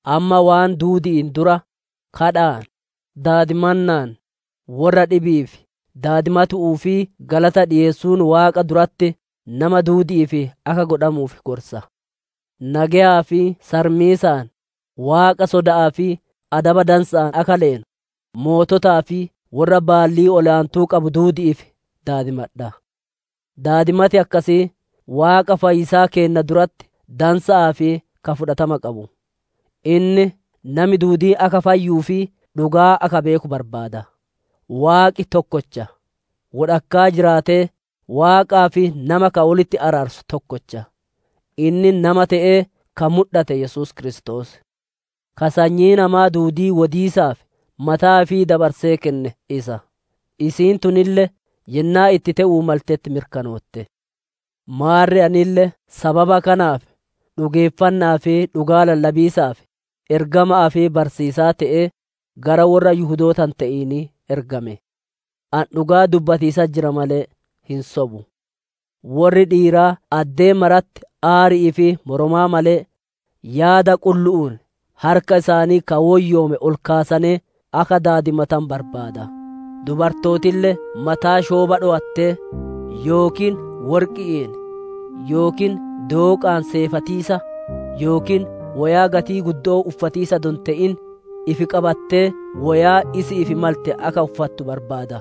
Amma waan duudi'iin dura, iyyannoon, daadimannaan, worra dhibi'iif daadimatu'uu fi galata dhikeessuun Waaqa duratti nama duudi'iif akka godhamuuf gorsa. Nageyaa fi sarmiisaan, Waaqa soda'aa fi adaba dansa'aan akka leenu, moototaa fi worra baallii ol aantuu qabu duudi'iif daadimadha'a. Daadimati akkasii Waaqa fayyisaa keenna duratti dansa'aa fi ka fudhatama qabu. Inni nami duudiin akka fayyuu fi dhugaa akka beeku barbaada. Waaqi tokkocha; wodhakkaa jiraatee Waaqaa fi nama ka wolitti araarsu tokkocha; inni nama te'ee ka mudhate Yesuus Kiristoos. Ka sanyii namaa duudii wodiisaaf mataa ifii dabarsee kenne isa; isiin tunille yennaa itti te'uu maltetti mirkanootte. Maarre anille sababa kanaaf dhugeeffanna'aa fi dhugaa lallabiisaaf ergama'aa fi barsiisaa te'ee, gara worra Yihudoota hin te'inii ergame. Ani dhugaa dubbatiisatti jira malee hin sobu. Worri dhiiraa addee maratti aari'ii fi moromaa malee, yaada qullu'uun harka isaanii ka woyyoome ol kaasanee akka daadimatanu barbaada. Dubartootille mataa shoobaa dhowattee, yookiin worqi'iin yookiin dooqaan seefatiisa, yookiin woyaa gatii guddo'oo uffatiisa adoo hin te'in, ifi qabattee woyaa isi'iif malte akka uffattu barbaada.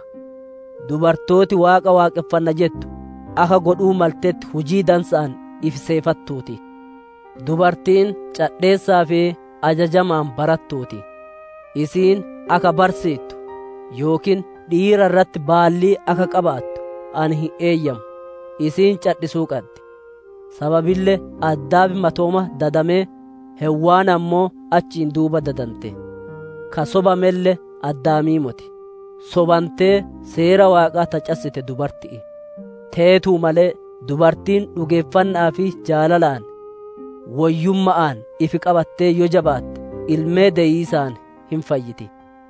Dubartooti Waaqa waaqonfanna jettu akka godhuu maltetti hujii dansa'aan ifi seefattuuti. Dubartiin cadheessaa fi ajajamaan barattuu ti. Isiin akka barsiittu yookiin dhiira irratti baallii akka qabaattu ani hin eeyyamu; isiin cadhisuu qaddi. Sababille Addaam matooma dadamee, Heewwan ammoo achiin duuba dadante. Ka sobamelle Addaamii moti; sobantee seera Waaqaa ta cassite dubartitti'i. Teetuu malee dubartiin dhugeeffanna'aa fi jaalalaan, woyyumma'aan ifi qabattee yoo jabaatte ilmee deyiisaan hin fayyiti.